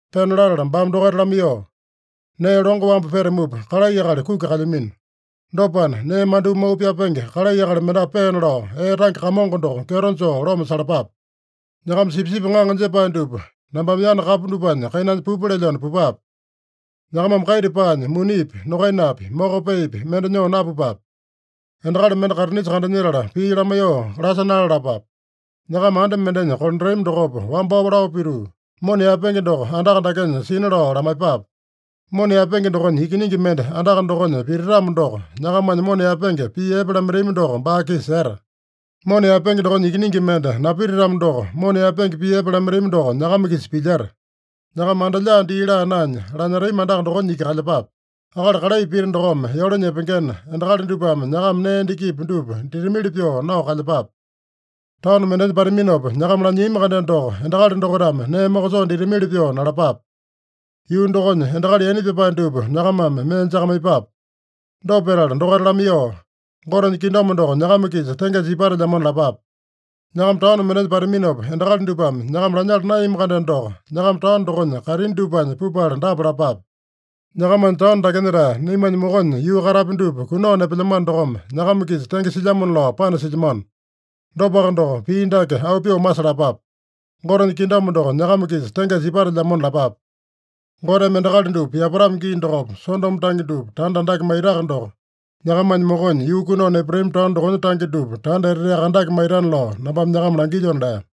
Pena latala baame dokaita lamaiyoo, “Nee longo wambu petamupa, kalai akali kuki kalyamino. Dopana, nee mandyoo mau pyapenge kalai akali mendapu peena lao, ee tange Kamongo doko kyeto joo loma salapape. Nyakama sipisipi ŋaŋa jepae dupa nambame yana kapu dupanya kainanya pupa lelyona pupape. Nyakamame kaita paanya, munipi, nokainapi, moko peepi mende nyoo napupape. Endakali mende kaitinisa kandanyetala pii lamaiyoo lasa nalalapape. Nyakama anda mendenya kolandatami dokopa wambao lao pituu, ‘Mona yaepenge doko andaka dakenya sina’ lao lamaiyepape. Mona yaepenge dokonya ikiningi mende andaka dokonya pititamo doko, nyakamanya mona yaepenge pii epe lamaitami doko baa-kisa seta. Mona yaepenge dokonya ikiningi mende napititamo doko, mona yaepenge pii epe lamaitami doko nyakama-kisa pilyeta. Nyakama anda lyaa dii laa naenya, lanyetami andaka dokonya iki kalyepape. Akali kalai pita dokome yole nyepengena, endakali dupame nyakama nee endakipi dupa ditamili pyoo nao kalyepape. Taono mendenya pataminopa nyakama lanyiami-kandeno doko, endakali dokaitame nee mokosoo ditamili pyoo nalapape. Yuu dokonya endakali yaina pyapae dupa nyakamame mee jakamaiyepape. Dopa petala dokaita lamaiyoo, ‘Gotenya kingdom doko nyakama-kisa tengesa ipatelyamona’ lapape. Nyakama taono mendenya pataminopa, endakali dupame nyakama lanyala naeyami-kandeno doko, nyakama taono dokonya kaitini dupanya pupala dapa lapape: ‘Nyakamanya taono dakenya-tae naimanya mokonya yuu katapya dupa kunao nepelyamano dokome, nyakama-kisa tenge silyamona lao panasilyamano. Dopaka doko, pii dake auu pyoo masalapape: Gotenya kingdom doko nyakama-kisa tengesa ipatelyamona’ lapape. Goteme endakali dupa yapatamo gii dokopa Sodomo tange dupa tanda andake maitaka doko, nyakamanya mokonya yuu kunao nepatami taono dokonya tange dupa tanda eteteaka andake maitana lao nambame nyakama langilyona” lea.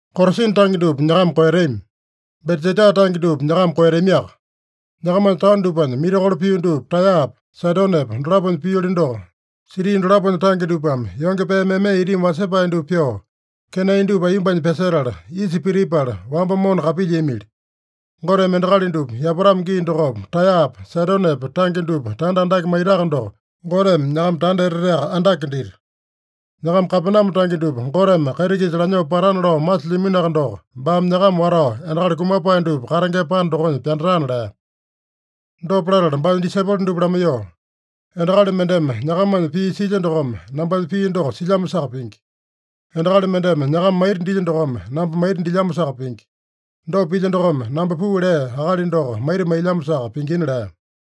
“Korasina tange dupa nyakama koeyatami. Betsaida tange dupa nyakama koeyatamiaka. Nyakamanya taono dupanya mirakolo pio dupa Taeyapa, Saidonepa dolaponya pioli doko, siti dolaponya tange dupame yonge pee meme itimi wasepae dupa pyoo, kenai dupa aiyombanya pyasetala, isa pitipala, wamba mona kapilyiamili. Goteme endakali dupa yapatamo gii dokopa Taeyapa, Saidonepa tange dupa tanda andake maitaka doko, Goteme nyakama tanda eteteaka andake dita. Nyakama Kapename tange dupa Goteme kaiti-kisa lanyoo patana lao masilyaminoaka doko, baame nyakama watao endakali kumapae dupa katengema panda dokonya pyandatana” lea. Dopa latala baanya disaipolo dupa lamaiyoo, “Endakali mendeme nyakamanya pii silya dokome, nambanya pii doko silyamosaka pingi. Endakali mendeme nyakama maita dilya dokome, namba maita dilyamosaka pingi. Dopa pilya dokome, namba puu lea Akali doko maita mailyamosaka pingina” lea.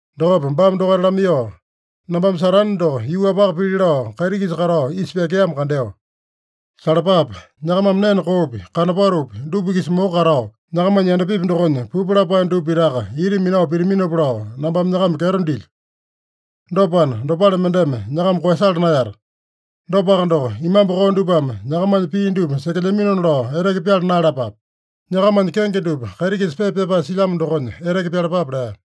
Dokopa baame dokaita lamaiyoo, “Nambame Satane doko yuu-wapaka pili lao kaiti-kisa katao isa pyakeamo kandeo. Salapape! Nyakamame nene koopi, kanopatopi dupa-kisa moko katao, nyakamanya yandapipi dokonya pupu lapae dupa pitaka ita minao pitaminopa lao nambame nyakama kyeto dilyo. Dopana, dopale mendeme nyakama koeyasala naeyata. Dopaka doko, imambu koo dupame nyakamanya pii dupa sekelyaminona lao eteke pyala naeyalapape. Nyakamanya kenge dupa kaiti-kisa pepa pyapae silyamo dokonya eteke pyalapape” lea.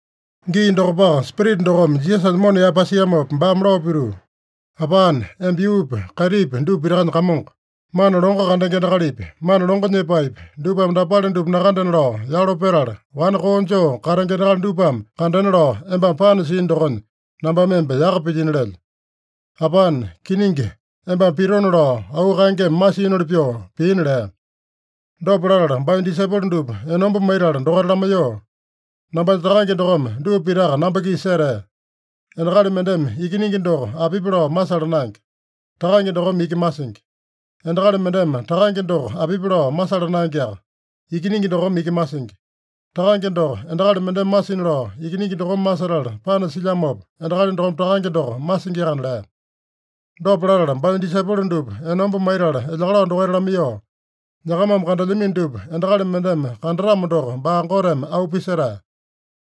Gii dokopaka Spirita dokome Jisasanya mona yaepasiamopa, baame lao pituu, “Apane, emba yuupi, kaitipi dupa pitakanya Kamongo. Mana longo kandenge endakalipi, mana longo nyepaepi, dupame dapale dupa nakandena lao yalo petala, wane koo joo katenge endakali dupame kandena lao embame panasiino dokonya nambame emba yaka pilyino lelyo. Apane, kiningi embame pitona lao auu kaengeme masiinoli pyoo piina” lea. Dopa latala baanya disaipolo dupa enomba maitala dokaita lamaiyoo, “Nambanya Takange dokome dupa pitaka namba-kisa setea. Endakali mendeme Ikiningi doko apipi lao masala naenge. Takange dokome iki masingi. Endakali mendeme Takange doko apipi lao masala naengeaka. Ikiningi dokome iki masingi. Takange doko endakali mendeme masina lao Ikiningi dokome masetala panasilyamopa, endakali dokome Takange doko masingiakana” lea. Dopa latala baanya disaipolo dupa enomba maitala elyakalao dokaita lamaiyoo, “Nyakamame kandelyamino dupa endakali mendeme kandatamo doko, baa Goteme auu pisetae.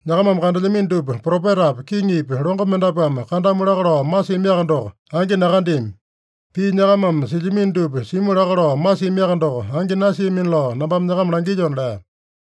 Nyakamame kandelyamino dupa, propetapi, kiŋipi, longo mendapuame kandamu laka lao masiamiaka doko, angi nakandeami. Pii nyakamame silyamino dupa simu laka lao masiamiaka doko, angi nasiamina lao nambame nyakama langilyona” lea.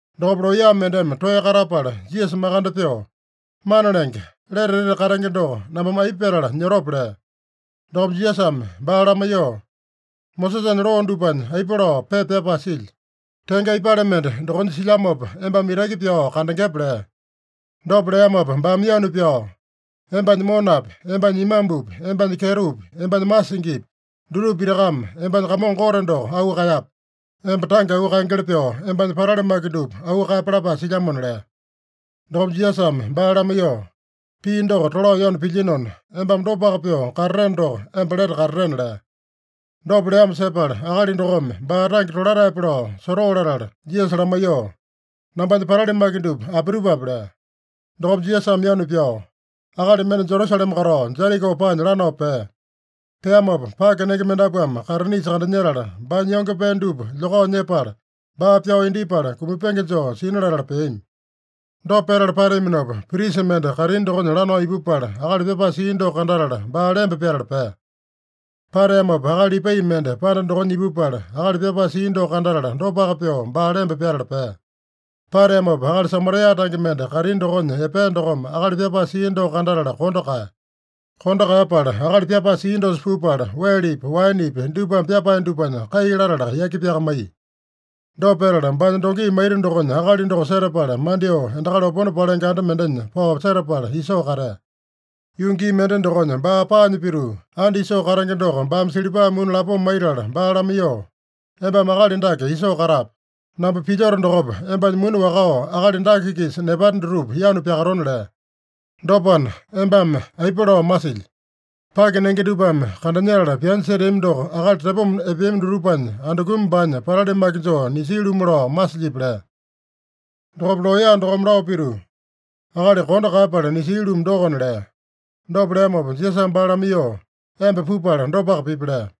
Dokopa looya mendeme toeya katapala Jisasa makande pyoo, “Mana Lenge, lete etete katenge doko nambame aipa petala nyotope?” lea. Dokopa Jisasame baa lamaiyoo, “Mosesanya loo dupanya aipa lao pepa pyapae silya? Tenge aipale mende dokonya silyamopa embame itaki pyao kandengepe?” lea. Dopa leamopa baame yanu pyao, “Embanya monapi, embanya imambupi, embanya kyetopi, embanya masingipi, dutupa pitakame embanya Kamongo Gote doko auu kaeyape. Emba tange auu kaengeli pyoo, embanya patali maki dupa auu kaeyape lapae silyamona” lea. Dokopa Jisasame baa lamaiyoo, “Pii doko tolao yanu pilyinona, embame dopaka pyoo katateno doko, emba lete katatena” lea. Dopa leamo sepala, akali dokome baa tange tolataepe lao sotoo latala Jisasa lamaiyoo, “Nambanya patali maki dupa apitupape?” lea. Dokopa Jisasame yanu pyao, “Akali mende Jerusalema katao, Jeriko paanya lanao pea. Peamopa pake nenge mendapuame kaitinisa kandanyetala, baanya yonge pee dupa lyokao nyepala, baa pyao indyepala, kumapenge joo sina latala peami. Dopa petala pateaminopa, prisa mende kaitini dokonya lanao ipupala, akali pyapae sia doko kandatala, baa lemba pyatala pea. Pateamopa akali Lipai mende panda dokonya ipupala, akali pyapae sia doko kandatala, dopaka pyoo baa lemba pyatala pea. Pateamopa akali Samaria tange mende kaitini dokonya epea dokome akali pyapae sia doko kandatala kondo kaeya. Kondo kaeyapala akali pyapae sia dosa pupala, welepi, waenepi dupame pyapae dupanya kai latala yaki pyakamaiya. Dopa petala, baanya dongi maita dokonya akali doko setapala, mandyoo endakali opone palenge anda mendenya pao setapala isoo katea. Yuu gii mende dokonya baa paanya pituu, anda isoo katenge doko baame silipa muni lapoma maitala baa lamaiyoo, ‘Embame akali dake isoo katape. Namba pilyoto dokopa, embanya muni wakao akali dake-kisa nepate dutupa yanu pyakatona’ lea. Dopana, embame aipa lao masilyi? Pake nenge dupame kandanyetala pyanya seteami doko, akali tepoma epeami dutupanya andukumi baanya patali maki joo nisia-lumu lao masilyipi?” lea. Dokopa looya dokome lao pituu, “Akali kondo kaeyapala nisia-lumu dokona” lea. Dopa leamopa Jisasame baa lamaiyoo, “Emba pupala dopaka pipi” lea.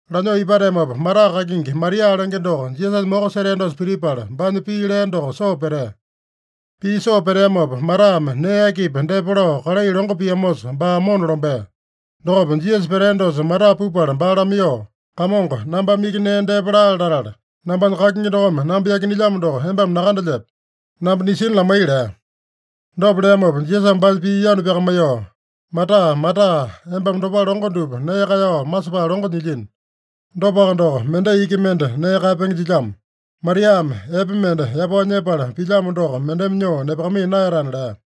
Lanyoo ipateamopa, Mata kakingi Maria lenge doko Jisasanya moko setea dosa pitipala, baanya pii lea doko soo petea. Pii soo peteamopa, Matame nee akipi depa lao kalai longo piamosa, baa mona lombea. Dokopa Jisasa petea dosa Mata pupala baa lamaiyoo, “Kamongo, nambame iki nee depa laale latala, nambanya kakingi dokome namba yakinelyamo doko embame nakandelyepe? Namba nisina lamai” lea. Dopa leamopa Jisasame baanya pii yanu pyakamaiyoo, “Mata, Mata, embame dopale longo dupa nee kaeyao masepae longo nyilyino. Dopaka doko, mendai iki mende nee kaeyapenge jilyamo. Mariame epe mende yapao nyepala pilyamo doko mendeme nyoo nepakamaiya naeyatana” lea.